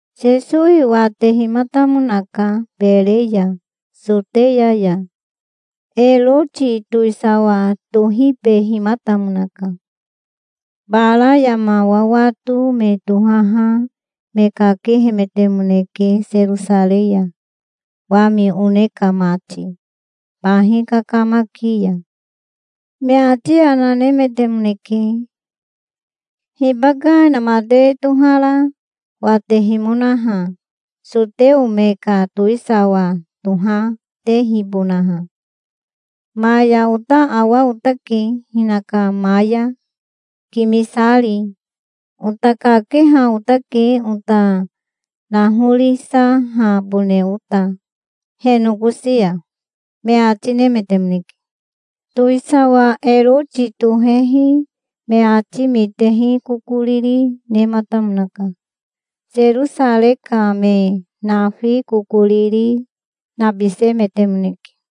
Sesowi watehimatamonaka Bere ya Soteya ya. Eroti towisawa tohibehimatamonaka. Bara yama wawato me tohaha me kakehemetemoneke Serosarei ya, wami one ka mati, bahi kakamaki ya. Me ati yana nemetemoneke. "Hibaka inamatewe tohara watehimonaha soteo me ka towisawa tohatehibonaha? Maya ota awa otake hinaka maya, kimisari. Ota kakeha otake ota nahorisahabone ota he nokosi ya", me ati nemetemoneke. Towisawa Eroti tohehi me ati mitehi kokoriri nematamonaka. Serosarei ka me nafi kokoriri, nabisemetemoneke.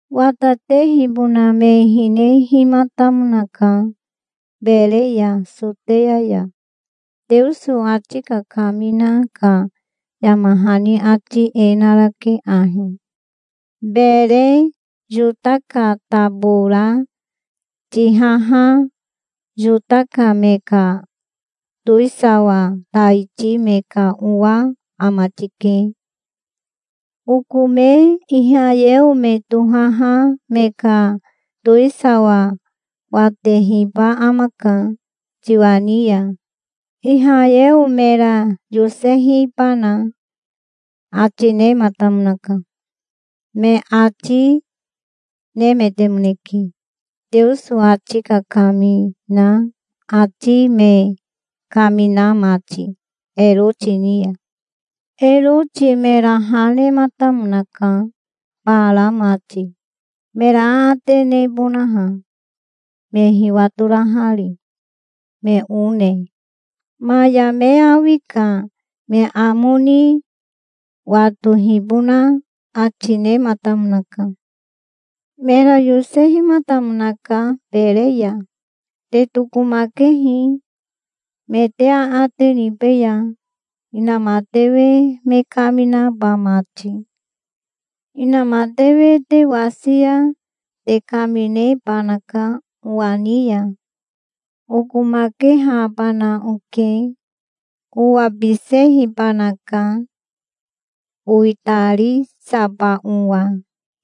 "Watatehibona me hinehimatamonaka, Bere ya Soteya ya. Teoso ati kakamina ka yama hani ati e narake ahi: 'Bere Yota ka tabora tihaha Yota ka me ka towisawa taiti me ka owa ama tike. Oko me Ihayeo me tohaha me ka towisawa watehiba amaka tiwa ni ya, Ihayeo mera yosehibana', ati nematamonaka", me ati nemetemoneke, Teoso ati kakamina ati me kamina mati Eroti ni ya. Eroti mera ha nematamonaka bara mati, mera aate nebonaha me hiwatorahari, me one. Maya me awi ka me amo ni watohibona ati nematamonaka. Mera yosehimatamonaka Bere ya. "Te tokomakehi. Me te aate nibeya, inamatewe me kaminaba mati. Inamatewe te wasi ya te kaminebanaka owa ni ya. Okomakehabana oke. Owabisehibanaka, owitarisaba owa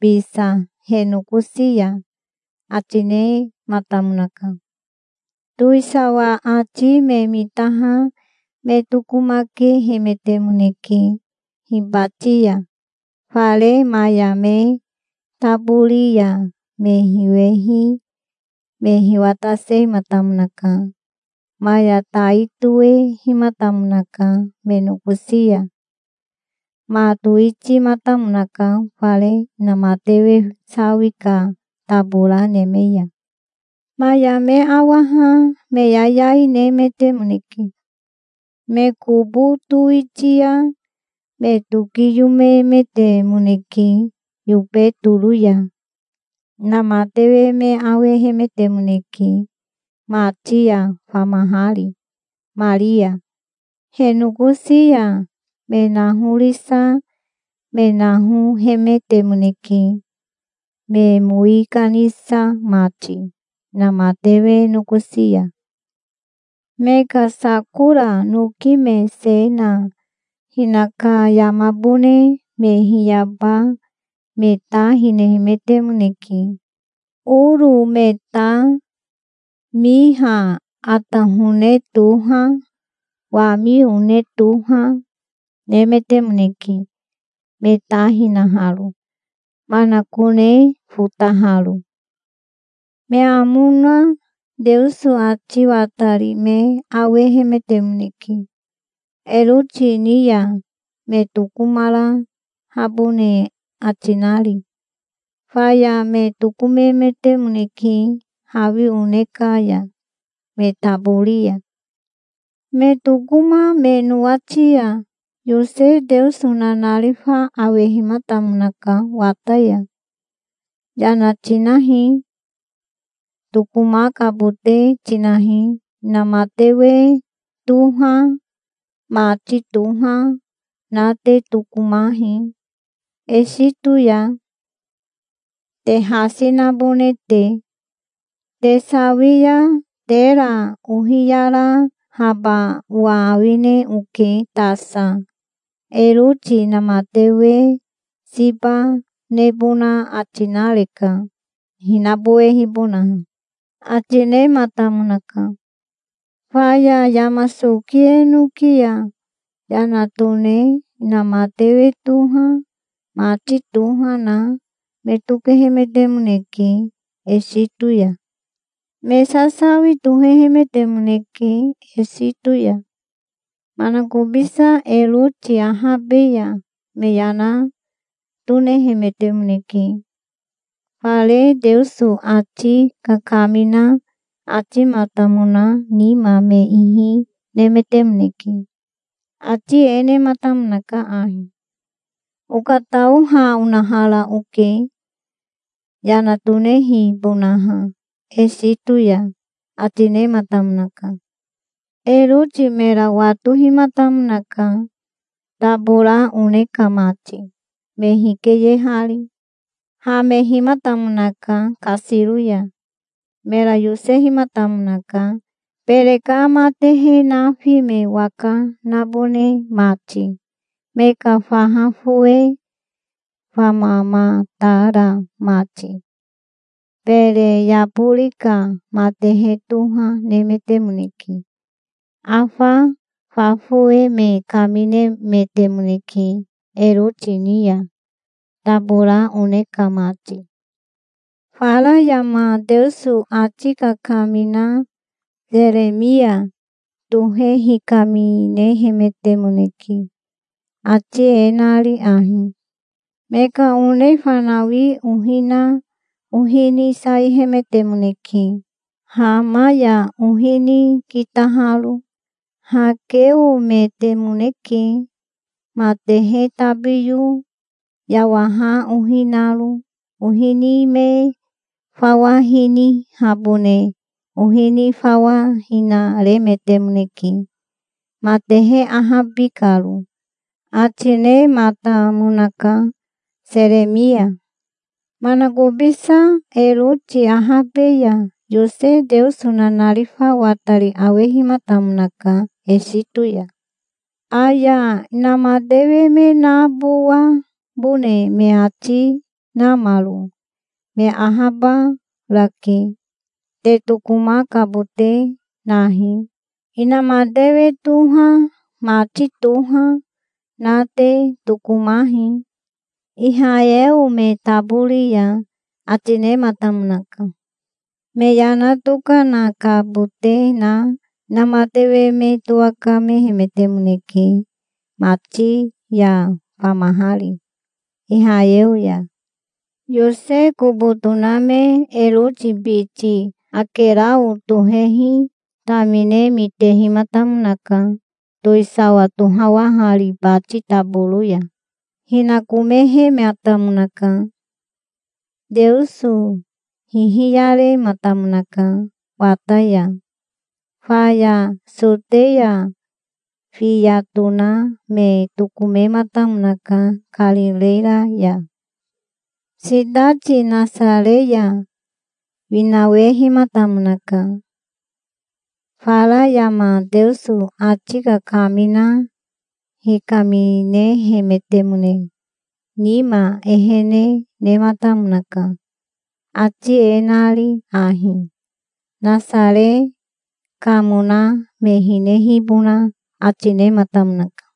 bisa he nokosi ya", ati nematamonaka. Towisawa ati me mitaha me tokomakehemetemoneke. Hibati ya fare maya me tabori ya me hiwehi me hiwatasehimatamonaka. Maya tai toehimatamonaka me nokosi ya. Ma towitimatamonaka fare inamatewe sawi ka tabora neme ya. Maya me awaha me yayai nemetemoneke. Me kobo towitia me tokiyomemetemoneke yobe toro ya. Inamatewe me awehemetemoneke mati ya famahari Maria. He nokosi ya me nahorisa me nahohemetemoneke, me mowi kanisa mati inamatewe nokosi ya. Me ka sakora noki me se na hinaka yamabone me hiyaba me ta hinehemetemoneke. Oro me ta, miha atahone toha, wami one toha, nemetemoneke, me ta hinaharo, manakone fotaharo. Me amo na Teoso ati watari me awehemetemoneke Eroti ni ya me tokomarahabone ati nari. Faya me tokomemetemoneke hawi one ka ya, me tabori ya. Me tokoma me nowati ya Yose Teoso nanarifa awehimatamonaka wata ya. "Yana tinahi. Tokomakabote tinahi. Inamatewe toha, mati toha, na te tokomahi Esito ya, te hasi nabone te. Te sawi ya tera ohiyarahaba owa awine oke tasa. Eroti inamatewe siba nebona ati nareka hinabowehibonaha", ati nematamonaka. Faya yama soki enoki ya yana tone inamatewe toha mati toha na me tokehemetemoneke Esito ya. Me sasawi tohehemetemoneke Esito ya. Manakobisa Eroti ahabe ya me yana tonehemetemoneke. Fare Teoso ati kakamina atimatamona nima me ihi nemetemoneke. Ati e nematamonaka ahi: "Okatao ha onahara oke yana tonehibonaha Esito ya", ati nematamonaka. Eroti mera watohimatamonaka, tabora one ka mati me hikeyehari. Hamehimatamonaka kasiro ya. Mera yosehimatamonaka Bere ka matehe nafi me waka nabone mati, me ka faha fowe famamatara mati. Bere yabori ka matehe toha nemetemoneke. Afa fa fowe me kaminemetemoneke Eroti ni ya, tabora one ka mati. Fara yama Teoso ati kakamina Seremia tohe hikaminehemetemoneke, ati e nari ahi: "Me ka one fanawi ohi na ohi ni saihemetemoneke, Hama ya ohi ni kitaharo. Hakeometemoneke matehe tabiyo, yawaha ohi naro. Ohi ni me fawa hinihabone ohi ni fawa hinaremetemoneke, matehe ahabi karo", ati nematamonaka Seremia. Manakobisa Eroti ahabe ya Yose Teoso nanarifa watari awehimatamonaka Esito ya. "Aya inamatewe me nabowabone me ati namaro me ahabarake. Te tokomakabote nahi. Inamatewe toha mati toha na te tokomahi Ihayeo me tabori ya", ati nematamonaka. Me yana tokanakabote na inamatewe me towakamehemetemoneke, mati ya famahari Ihayeo ya. Yose kobo toname Eroti biti Akerao tohehi tamine mitehimatamonaka towisawa tohawahari bati taboro ya. Hinakomehematamonaka. Teoso hihiyarematamonaka wata ya. Faya Soteya fiya toname tokomematamonaka Karireya ya. Sitati Nasare ya winawehimatamonaka. Fara yama Teoso ati kakamina hikaminehemetemone nima ehene nematamonaka, ati e nari ahi. Nasare kamona me hinehibona ati nematamonaka.